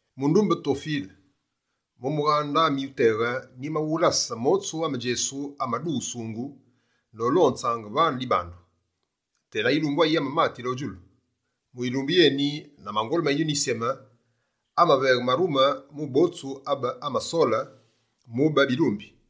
Mundumbe Tofile, mu mughande ami wuteghe, nyimawulase motsu ame Djesu amadughusungu nolonzaange vane dibandu tena yilumbu ayi amamatile o djulu. Mu yilumbu yeni, na mangolu ma Yinyuni Yisyeme, amaveghe marume mu botsu abe amasole mube bilumbi.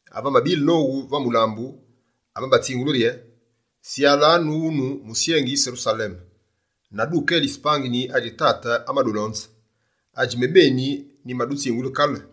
Ave amabile nowu va mulambu, amabatsingule rye: «Syalanu wune musyengi Serusaleme, na dukelise pangini adji Tate amadulonze, adji mebeni nyimadutsingule kale.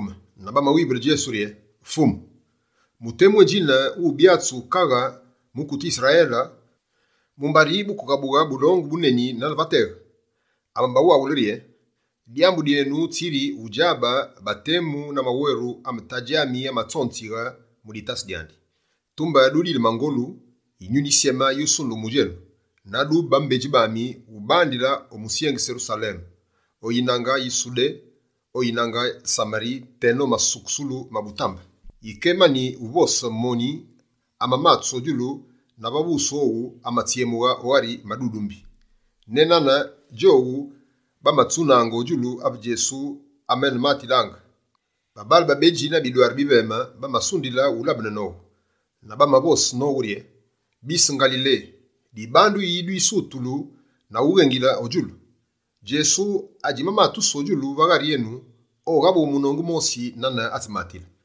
Djowu bamaghukeme na bamawivule Djesu rye: «Fumu, mu temu edjine wubyatsu kaghe mukute Yisrayele, mumbari wukeghabughe bulongu buneni nane va teghe?» Amabawaghule rye: «Dyambu dyenu tsiri udjabe batemu na maweru ame Tadji ami amatsonzighe mu ditase dyandi.» Tumbe dudile mangolu, Yinyuni Yisyeme yusundughe mu djenu, na dube bambedji bami ubandile o musyengi Serusaleme, o yinange yi Sudé, o yinange Samari teno masukusulu ma butambe. Yike emani uvose moni, amamatusu o djulu na va wusu owu, amatsyemughe o ghari madudumbi. Nenane djowu bamatsuninaange o djulu ave Djesu amenematilaange, babaale babedji na bidwaru biveme bamasundile wulabene nowu. Na bamavose nowu rye: «Bise Ngalile, dibandu yi dwisutulu na ughengile o djulu? Djesu adjitsimatusu o djulu va ghari enu, oghabughe munongu mosi nane atsimatile.»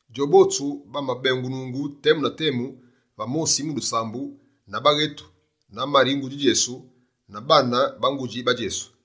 Djobotsu bamabengunungu temu na temu va mosi mu dusambu, na baghetu, na Mari ngudji Djesu, na baane ba ngudji ba Djesu.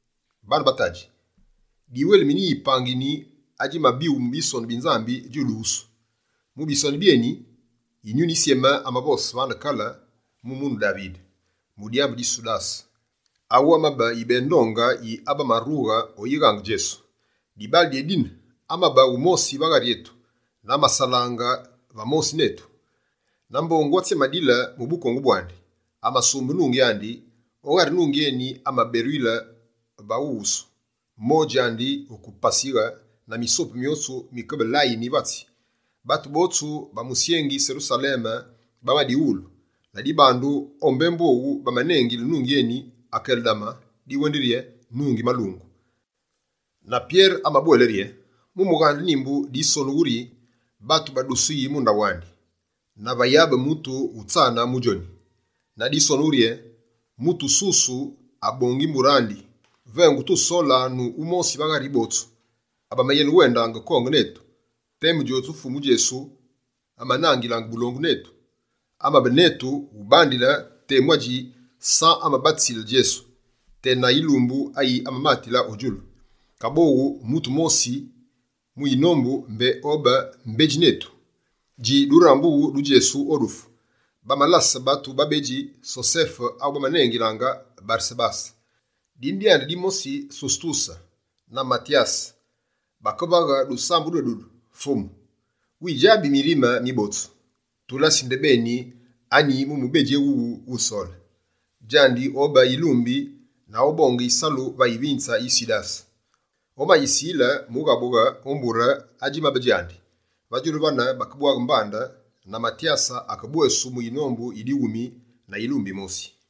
«Baane ba tadji, diwelimine yi pangini adjimabighu mu Bisonu bi Nzambi djuduwusu. Mu Bisonu byeni, Yinyuni Yisyeme amavose vane kale mu munu Davide, mu dyambu di Sudase Sudase: adjinengulu «Yikalyote»., awu amabe yibeghe ndonge yi abamarughe o uyighaange Djesu. Dibaale dyédine, amabe wumosi va ghari etu, na amasalaange va mosi netu. Na mbongu atsi amadile mu bukongu bwandi, amasumbe nungi andi. O ghari nungi eni amaberuyile maghuwusu, modji andi wuke pasighe na misopu myotsu mikebe layini va tsi. Batu botsu ba musyengi Serusaleme bamadiwulu, la dibandu o mbembu owu, bamanengilile nungi eni “Akeldama” diwendi yiri: “Nungi malungu”.» Na Pyere amabwele rye: «Mu mughande Nyimbu, disonu rye: “Batu badusuyi mu ndaghu andi, na vayabe mutu wutsane mu djoni.” Na disonu rye: “Mutu mususu abongi mbure andi.” Vengu tusolanu wumosi va ghari botsu abamayenewendaange konge netu, temu djotsu Fumu Djesu amanangilaange bulongu netu. Amabe netu ubandile temu adji San amabatisile Djesu, tena yilumbu ayi amamatile o djulu. Kaboghu, mutu mosi mu yinombu mbé obe mbedji netu, dji durambughu du Djesu o dufu.» Bamalase batu babedji: Sosefe awu bamanengilaange «Baresabase», dine dyandi dimosi «Susutuse» na Matyase. Bakevaghe dusambu dwedudu: «Fumu, widjabi mirime mi botsu. Tulasi ndebeni, anyi mu mubedji éwuwu, wusole. Djandi obe yilumbi, na obonge yisalu va yivinze yi Sudase, omayisile mughabughe o mbure adjimabe djandi.» Va djulu vane, bakebwaghe mbande, na Matyase akebwesu mu yinombu yi dighumi na yilumbi yimosi.